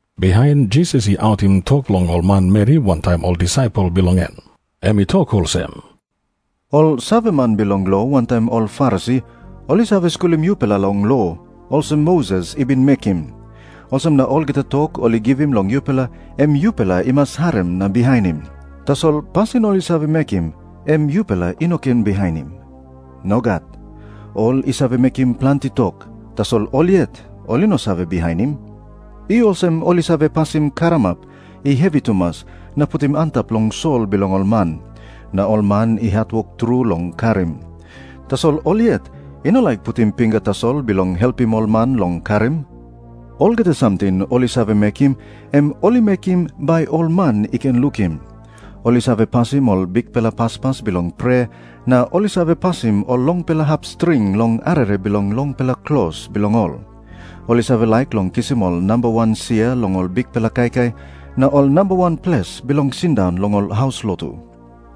Bihain Jisas i autim tok long ol manmeri wantaim ol disaipel bilong en. Em i tok olsem, "Ol saveman bilong lo wantaim ol Farisi ol i save skulim yupela long lo, olsem Moses i bin mekim. Olsem na olgeta tok ol i givim long yupela, em yupela i mas harim na bihainim. Tasol pasin ol i save mekim, em yupela i no ken bihainim. Nogat. Ol i save mekim planti tok, tasol ol yet ol i no save bihainim. I olsem ol i save pasim karamap i hevi tumas na putim antap long sol bilong ol man, na ol man i hatwok tru long karim. Tasol ol yet i no laik putim pinga tasol bilong helpim ol man long karim. Olgeta samting ol i save mekim, em ol i mekim bai ol man i ken lukim. Ol i save pasim ol bikpela paspas bilong prea, na ol i save pasim ol longpela hap string long arere bilong longpela klos bilong ol. Ol i save laik long kisim ol namba wan sia long ol bikpela kaikai, na ol namba wan ples bilong sindaun long ol haus lotu.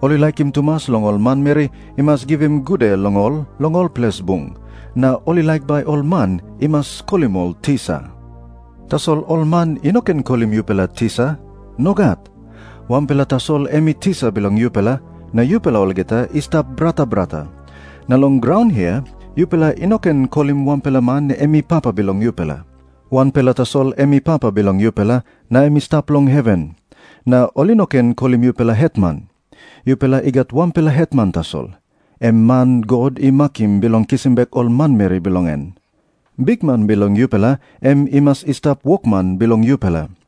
Ol i laikim tumas long ol manmeri i mas givim gude long ol long ol ples bung, na ol i laik bai ol man i mas kolim ol 'Tisa.' "Tasol ol man i no ken kolim yupela 'Tisa.' Nogat. Wanpela tasol em i tisa bilong yupela, na yupela olgeta i stap brata brata. Na long graun hia yupela i no ken kolim wanpela man em i papa bilong yupela. Wanpela tasol em i Papa bilong yupela, na em i stap long heven. Na ol i no ken kolim yupela 'Hetman.' Yupela i gat wanpela hetman tasol, em man God i makim bilong kisim bek ol manmeri bilong en. Bikman bilong yupela em i mas i stap wokman bilong yupela.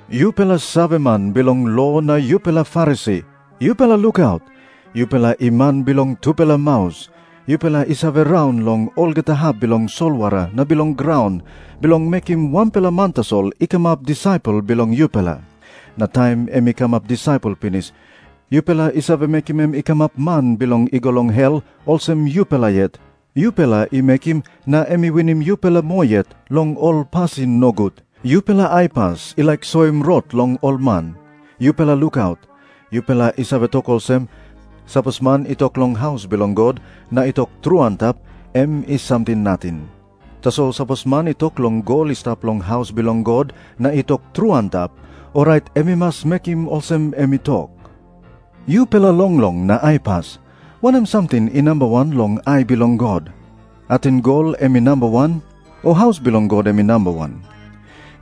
"Yupela saveman bilong lo na yupela Farisi, yupela lukaut. Yupela i man bilong tupela maus. Yupela i save raun long olgeta hap bilong solwara na bilong graun, bilong mekim wanpela man tasol i kamap disaipel bilong yupela. Na taim em i kamap disaipel pinis, yupela i save mekim em i kamap man bilong i go long hel, olsem yupela yet. Yupela i mekim na em i winim yupela moa yet long ol pasin nogut. "Yupela aipas i laik soim rot long ol man, yupela lukaut. Yupela i save tok olsem, 'Sapos man i tok long haus bilong God na i tok tru antap, em i samting nating. Tasol sapos man i tok long gol i stap long haus bilong God na i tok tru antap, orait em i mas mekim olsem em i tok.' Yupela longlong na aipas, wanem samting i nambawan long ai bilong God? Ating gol em i nambawan? O haus bilong God em i nambawan?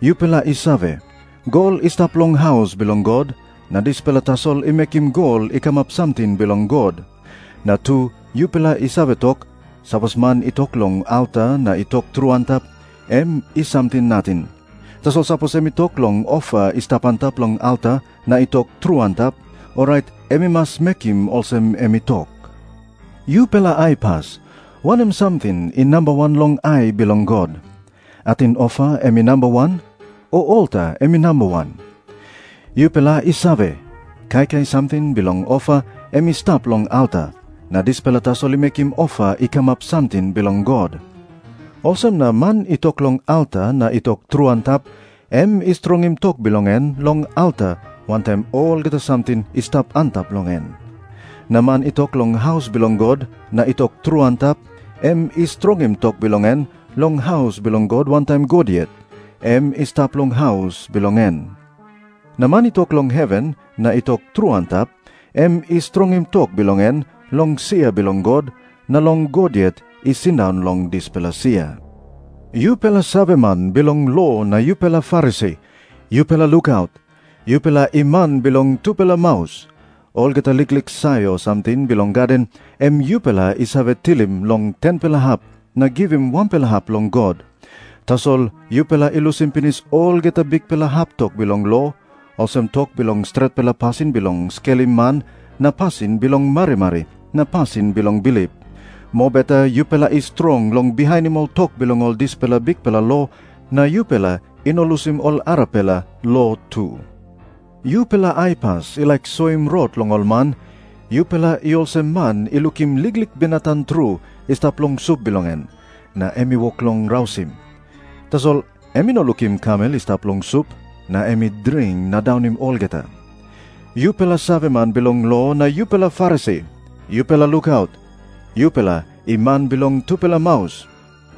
Yupela i save, gol i stap long haus bilong God, na dispela tasol i mekim gol i kamap samting bilong God. Na tu yupela i save tok, 'Sapos man i tok long alta na i tok tru antap, em i samting nating. Tasol sapos em i tok long ofa i stap antap long alta na i tok tru antap, orait em i mas mekim olsem em i tok.' Yupela aipas, wanem samting i nambawan long ai bilong God? Ating ofa em i nambawan? O alta em i nambawan? Yupela i save, kaikai samting bilong ofa em i stap long alta, na dispela tasol i mekim ofa i kamap samting bilong God. Olsem na man i tok long alta na i tok tru antap, em i strongim tok bilong en long alta wantaim olgeta samting i stap antap long en. Na man i tok long haus bilong God na i tok tru antap, em i strongim tok bilong en long haus bilong God wantaim God yet, em i stap long haus bilong en. Na man i tok long heven na i tok tru antap, em i strongim tok bilong en long sia bilong God na long God yet i sindaun long dispela sia. "Yupela saveman bilong lo na yupela Farisi, yupela lukaut. Yupela i man bilong tupela maus. Olgeta liklik sayor samting bilong gaden em yupela i save tilim long 10-pela hap na givim wanpela hap long God. Tasol yupela i lusim pinis olgeta bikpela hap tok bilong lo, olsem tok bilong stretpela pasin bilong skelim man na pasin bilong marimari na pasin bilong bilip. Mobeta yupela i strong long bihainim ol tok bilong ol dispela bikpela lo, na yupela i no lusim ol arapela lo tu. Yupela aipas i laik soim rot long ol man, yupela i olsem man i lukim liklik binatang tru i stap long sup bilong en, na em i wok long rausim. Tasol em i no lukim kamel i stap long sup, na em i dring na daunim olgeta. "Yupela saveman bilong lo na yupela Farisi, yupela lukaut. Yupela i man bilong tupela maus.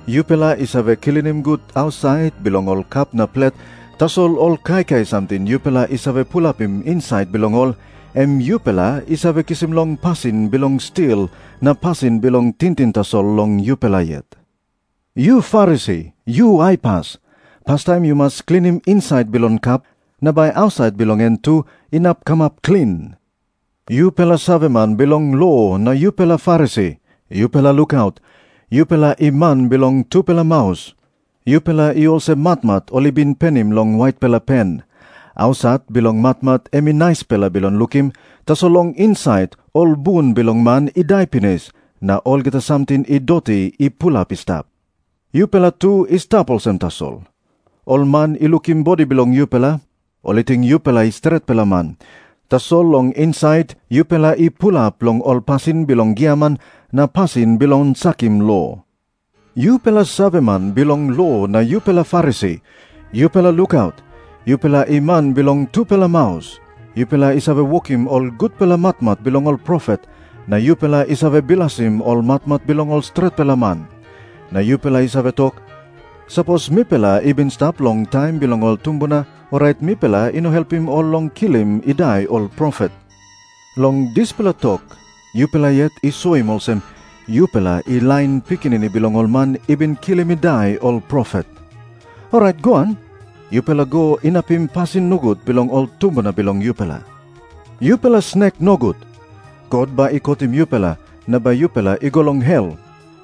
Yupela i save klinim gut ausait bilong ol kap na plet, tasol ol kaikai samting yupela i save pulapim insait bilong ol, em yupela i save kisim long pasin bilong stil na pasin bilong tingting tasol long yupela yet. Yu Farisi, yu aipas. Pastaim yu mas klinim insait bilong kap, na bai ausait bilong en tu inap kamap klin. "Yupela saveman bilong lo na yupela Farisi, yupela lukaut. Yupela i man bilong tupela maus. Yupela i olsem matmat ol i bin penim long waitpela pen. Ausait bilong matmat em i naispela bilong lukim, tasol long insait ol bun bilong man i dai pinis na olgeta samting i doti i pulap i stap. Yupela tu i stap olsem tasol. Ol man i lukim bodi bilong yupela, ol i ting yupela i stretpela man. Tasol long insait yupela i pulap long ol pasin bilong giaman na pasin bilong sakim lo." Jisas i tok moa olsem, "Yupela saveman bilong lo na yupela Farisi, yupela lukaut. Yupela i man bilong tupela maus. Yupela i save wokim ol gutpela matmat bilong ol profet, na yupela i save bilasim ol matmat bilong ol stretpela man. Na yupela i save tok, 'Sapos mipela i bin i stap long taim bilong ol tumbuna, orait mipela i no helpim ol long kilim i dai ol profet.' Long dispela tok yupela yet i soim olsem, yupela i lain pikinini bilong ol man i bin kilim i dai ol profet. Orait goan, yupela go inapim pasin nogut bilong ol tumbuna bilong yupela. Yupela snek nogut. God bai i kotim yupela na bai yupela i go long hel.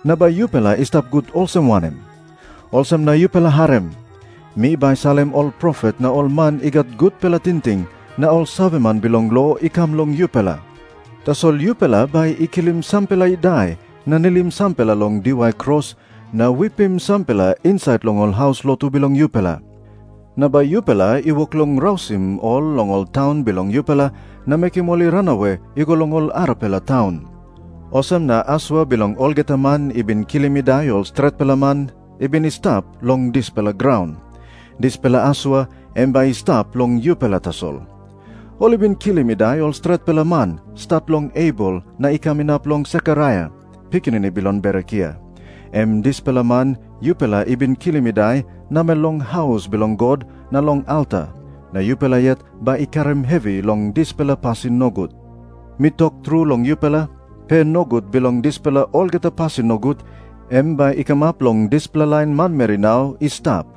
Na bai yupela i stap gut olsem wanem? "Olsem na yupela harim. Mi bai salim ol profet na ol man i gat gutpela tingting na ol saveman bilong lo i kam long yupela. Tasol yupela bai i kilim sampela i dai na nilim sampela long diwai kros na wipim sampela insait long ol haus lotu bilong yupela. Na bai yupela i wok long rausim ol long ol taun bilong yupela na mekim ol i ranawe i go long ol arapela taun. Olsem na asua bilong olgeta man i bin kilim i dai ol stretpela man i bin i stap long dispela graun, dispela asua em bai i stap long yupela tasol. Ol i bin kilim i dai ol stretpela man, stat long Abel na i kam inap long Sekaraia, pikinini bilong Berekia, em dispela man yupela i bin kilim i dai namel long haus bilong God na long alta, na yupela yet bai i karim hevi long dispela pasin nogut. Mi tok tru long yupela, pe nogut bilong dispela olgeta pasin nogut, em bai i kamap long dispela lain manmeri nau i stap."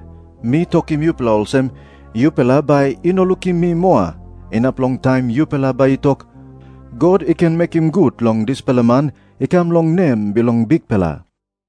Mi tokim yupela olsem, yupela bai i no lukim mi moa, inap long taim yupela bai i tok, 'God i ken mekim gut long dispela man i kam long nem bilong Bikpela.'"